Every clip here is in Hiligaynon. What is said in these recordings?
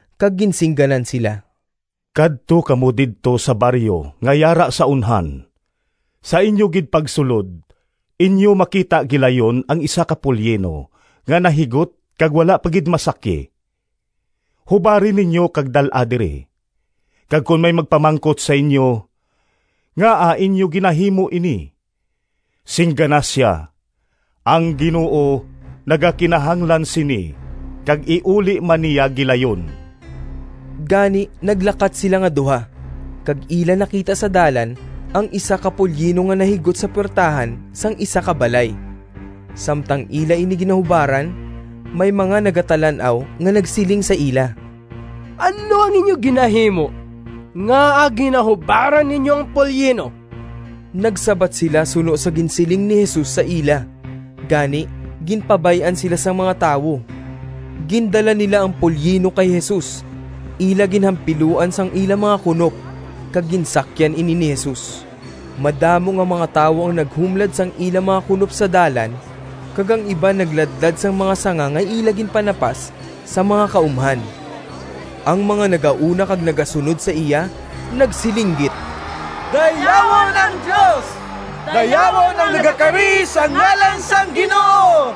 kag ginsingganan sila, “Kadto kamo didto sa baryo nga yara sa unhan. Sa inyo gid pagsulod, inyo makita gilayon ang isa ka polyino nga nahigot kag wala pa gid masakyi. Hubari ninyo kag dal-a diri. Kag kon may magpamangkot sa inyo, ‘Ngaa inyo ginahimo ini?’ singgana sia, ‘Ang Ginoo nagakinahanglan sini kag iuli man niya gilayon.’” Gani naglakat sila nga duha, kag ila nakita sa dalan ang isa ka polyino nga nahigot sa puwertahan sang isa ka balay. Samtang ila ini ginahubaran, may mga nagatalan-aw nga nagsiling sa ila, “Ano ang inyo ginahimo? Ngaa ginahubaran ninyo ang polyino?” Nagsabat sila suno sa ginsiling ni Jesus sa ila, gani ginpabay-an sila sang mga tawo. Gindala nila ang polyino kay Jesus, ila ginhampiluan sang ila mga kunop, kag ginsakyan ini ni Jesus. Madamo nga mga tawo ang naghumlad sang ila mga kunop sa dalan kag ang iban nagladlad sang mga sanga nga ila ginpanapas sa mga kaumhan. Ang mga nagauna kag nagasunod sa iya nagsilinggit, “Dayawon ang Dios! Dayawon ang nagakari sa ngalan sang Ginoo!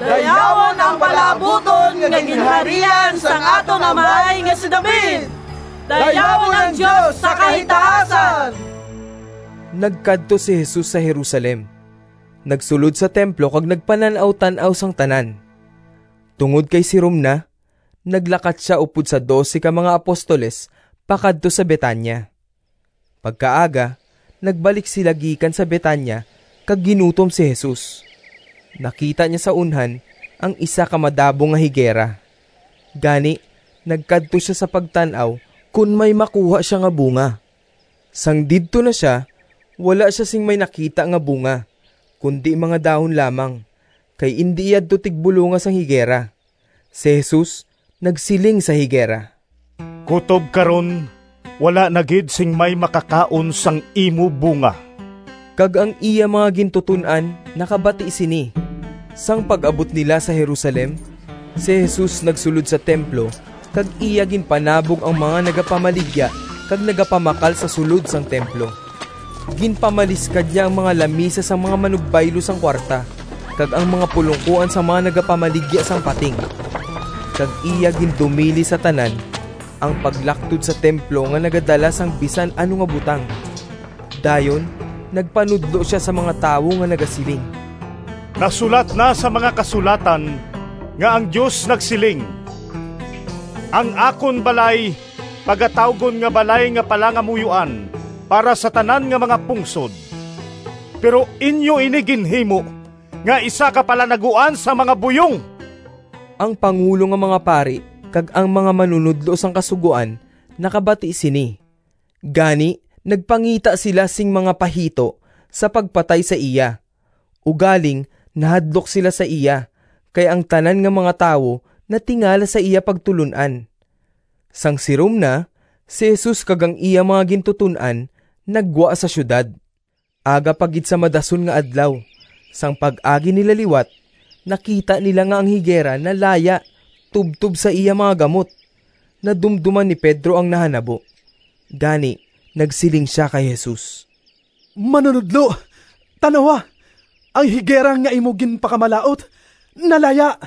Dayawon ang palaabuton nga ginharian sang aton amay nga si David! Dayawon ang Dios sa kahitaasan!” Nagkadto si Jesus sa Jerusalem, nagsulod sa templo kag nagpanan-awtan-aw sang tanan. Tungod kay sirom na, naglakat sia upod sa dose ka mga apostoles pakadto sa Betania. Pagkaaga, nagbalik sila gikan sa Betania kag ginutom si Jesus. Nakita niya sa unhan ang isa ka madabong nga higera, gani nagkadto sia sa pagtan-aw kon may makuha sia nga bunga. Sang didto na sia, wala sia sing may nakita nga bunga, kundi mga dahon lamang, kay indi yadto tigbulonga sang higera. Si Jesus nagsiling sa higera, “Kutob karon wala na gid sing may makakaon sang imo bunga!” Kag ang iya mga gintuton-an nakabati sini. Sang pag-abot nila sa Jerusalem, si Jesus nagsulod sa templo kag iya ginpanabog ang mga nagapamaligya kag nagapamakal sa sulod sang templo. Ginpamaliskad niya ang mga lamisa sang mga manugbaylo sang kuwarta kag ang mga pulongkoan sang mga nagapamaligya sang pating, kag iya gindumili sa tanan ang paglaktod sa templo nga nagadala sang bisan ano nga butang. Dayon nagpanudlo sia sa mga tawo nga nagasiling, “Nasulat na sa mga Kasulatan nga ang Dios nagsiling, ‘Ang akon balay pagatawgon nga balay nga palangamuyoan para sa tanan nga mga pungsod.’ Pero inyo ini ginhimo nga isa ka palanaguan sang mga buyong!” Ang pangulo nga mga pari kag ang mga manunodlo sang Kasugoan nakabati sini. Gani, nagpangita sila sing mga pahito sa pagpatay sa iya. Ugaling nahadlok sila sa iya, kay ang tanan nga mga tawo natingala sa iya pagtulon-an. Sang sirom na, si Jesus kag ang iya mga gintuton-an naggwa sa siyudad. Aga pa gid sa madason nga adlaw, sang pag-agi nila liwat, nakita nila nga ang higera nalaya tubtob sa iya mga gamot. Nadumdoman ni Pedro ang nahanabo, gani nagsiling sia kay Jesus, “Manunodlo, tan-awa! Ang higera nga imo ginpakamalaut nalaya!”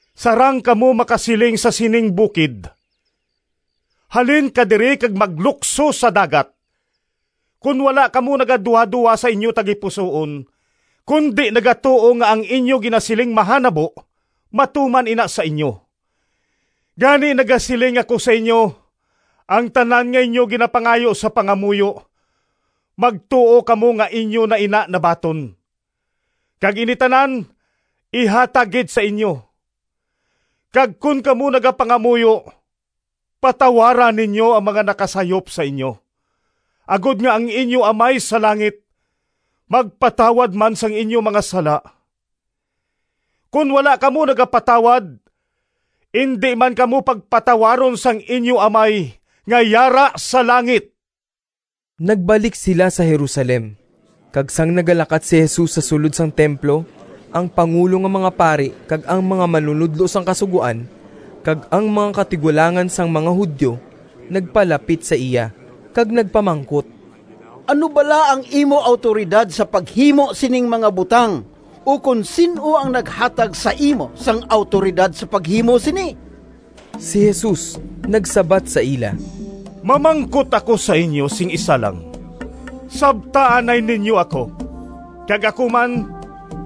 sarang kamo makasiling sa sining bukid, ‘Halin ka diri kag maglukso sa dagat.’ Kon wala kamo nagaduhadoha sa inyo tagipusoon, kundi nagatuo nga ang inyo ginasiling mahanabo, matuman ina sa inyo. Gani nagasiling ako sa inyo, ang tanan nga inyo ginapangayo sa pangamuyo, magtuo kamo nga inyo na ina nabaton, kag ini tanan ihatag gid sa inyo. Kag kon kamo nagapangamuyo, patawara ninyo ang mga nakasayop sa inyo, agod nga ang inyo Amay sa langit magpatawad man sang inyo mga sala. [ Kon wala kamo nagapatawad, indi man kamo pagpatawaron sang inyo Amay nga yara sa langit.]” Nagbalik sila sa Jerusalem. Kag sang nagalakat si Jesus sa sulod sang templo, ang pangulo nga mga pari kag ang mga manunodlo sang Kasugoan kag ang mga katigulangan sang mga Judio nagpalapit sa iya kag nagpamangkot, “Ano bala ang imo awtoridad sa paghimo sining mga butang, ukon sin-o ang naghatag sa imo sang awtoridad sa paghimo sini?” Si Jesus nagsabat sa ila, “Mamangkot ako sa inyo sing isa lang, sabta anay ninyo ako kag ako man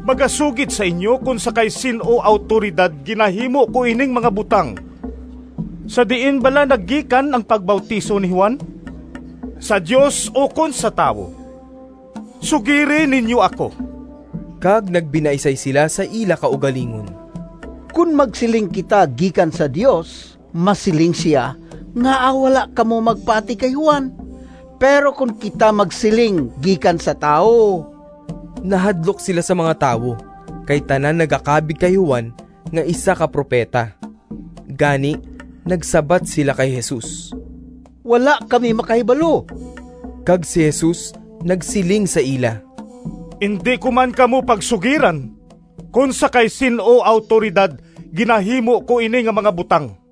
magasugid sa inyo kon sa kay sin-o awtoridad ginahimo ko ining mga butang. Sa diin bala naggikan ang pagbautiso ni Juan: sa Dios ukon sa tawo? Sugiri ninyo ako!” Kag nagbinaisay sila sa ila kaugalingon, “Kon magsiling kita, ‘Gikan sa Dios,’ masiling sia, ‘Ngaa wala kamo magpati kay Juan?’ Pero kon kita magsiling, ‘Gikan sa tawo…’” (Nahadlok sila sa mga tawo, kay tanan nagakabig kay Juan nga isa ka propeta.) Gani, nagsabat sila kay Jesus, “Wala kami makahibalo.” Kag si Jesus nagsiling sa ila, “Indi ko man kamo pagsugiran kon sa kay sin-o awtoridad ginahimo ko ini nga mga butang.”